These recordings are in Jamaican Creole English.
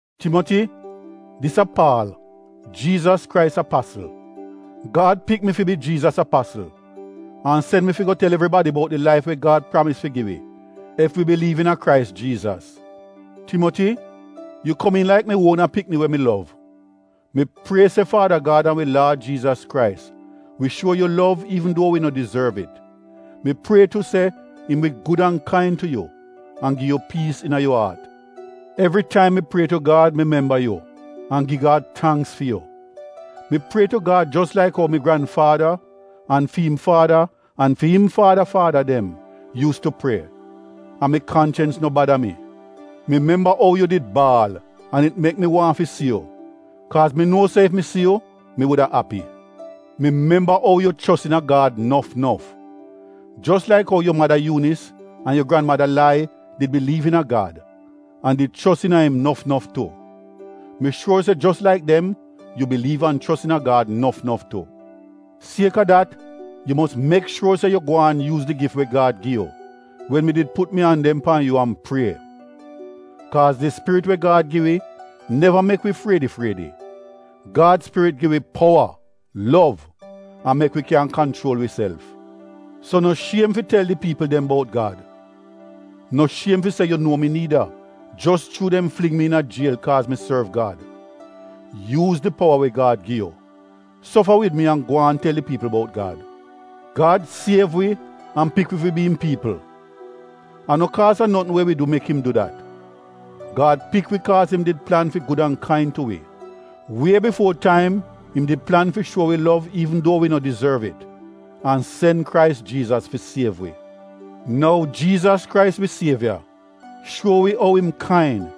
Timoti, dis a Paal, Jiizas Krais apasl. Gad pik mi fi bi Jiizas apasl an sen mi fi go tel evribadi bout di laif we Gad pramis fi gi wi ef wi biliiv iina Krais Jiizas. Timoti, yu komiin laik mi uona pikni we mi lov, mi prie se Faada Gad an wi Laad Jiizas Krais wi shuo yu lov iivn duo wi no dizorv it, mi prie tu se im wi gud an kain tu yu an gi yu piis iina yu aat. Evri taim mi prie tu Gad mi memba yu an gi Gad tangks fi yu. Mi prie tu Gad jos laik ou mi granfaada an fi im faada an fi im faada faada dem yuus tu prie, an mi kanchens no bada mi. Mi memba ou yu did baal an it mek mi waahn fi si yu. Kaaz mi nuo se ef mi si yu mi wuda api. Mi memba ou yu chos iina Gad nof nof. Jos laik ou yu mada Yuunis an yu granmada Lai did biliiv iina Gad an did chos iina im nof nof tu. Mi shuor se jos laik dem yu biliiv an chos iina Gad nof nof tu. Sieka dat yu mos mek shuor se yu gwaan yuuz di gif we Gad gi yu wen mi did put mi an dem pan yu an prie. Kaaz di spirit we Gad gi wi, neva mek wi friedi-friedi. Gad spirit gi wi powa, lov an mek wi kyan kanchuol wiself. So no shiem fi tel di piipl dem bout Gad. No shiem fi se yu nuo mi niida, jos chuu dem fling mi iina jiel kaaz mi sorv Gad. Yuuz di powa we Gad gi yu. Sofa wid mi an gwaan tel di piipl bout Gad. Gad siev wi an pik wi fi bi im piipl. A no kaaz a notn we wi du mek im du dat. Gad pik wi kaaz im did plan fi gud an kain tu wi. Wie bifuo taim im di plan fi shuo wi lov an sen Krais Jiizas fi siev wi. Nou Jiizas Krais wi sievya shuo wi ou im kain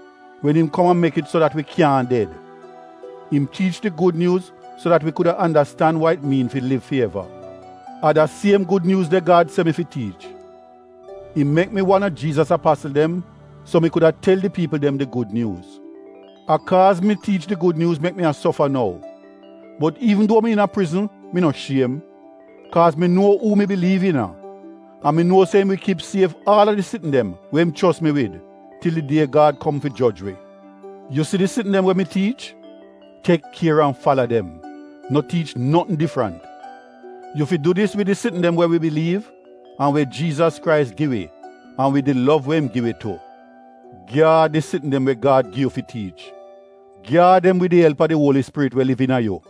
wen im kom an mek it so dat wi kyaahn ded. Im tiich di Gud Nyuuz so dat wi kuda andastan wa it miin fi liv fi eva. A da siem Gud Nyuuz de Gad se mi fi tiich. Im mek mi wan a Jiizas apasl dem so mi kuda tel di piipl dem di Gud Nyuuz. A kaaz mi tiich di Gud Nyuuz mek mi a sofa nou. Bot iivn duo mi iina prizn mi no shiem, kaaz mi nuo uu mi biliiv iina. An mi nuo se im wi kip sief aal a di sitn dem we im chos mi wid til di die Gad kom fi joj wi. Yu si di sitn dem we mi tiich, tek kier an fala dem, no tiich notn difrant. Yu fi du dis wid di sitn dem we wi biliiv an we Jiizas Krais gi wi an wid di lov we im gi wi tu. Gyaad di sitn dem we Gad gi yu fi tiich. Gyaad dem wid di elp a di Uoli Spirit we liv iina yu.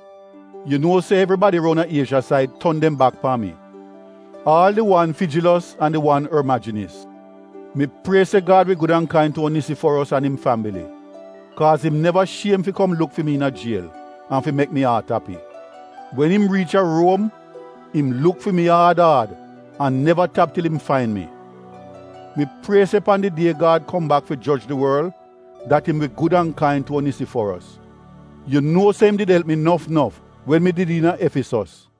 Yu nuo se evribadi roun a Iezha said ton dem bak pan mi, aal di wan Fijilos an di wan Ormajinis. Mi prie se Gad wi gud an kain tu Onisiforos an im fambili. Kaaz im neva shiem fi kom luk fi mi iina jiel an fi mek mi aat api. Wen im riich a Ruom im luk fi mi aad aad an neva tap til im fain mi. Mi prie se pan di die Gad kom bak fi joj di worl dat im wi gud an kain tu Onisiforos. Yu nuo se im did elp mi nof nof wen mi did iina Efisos.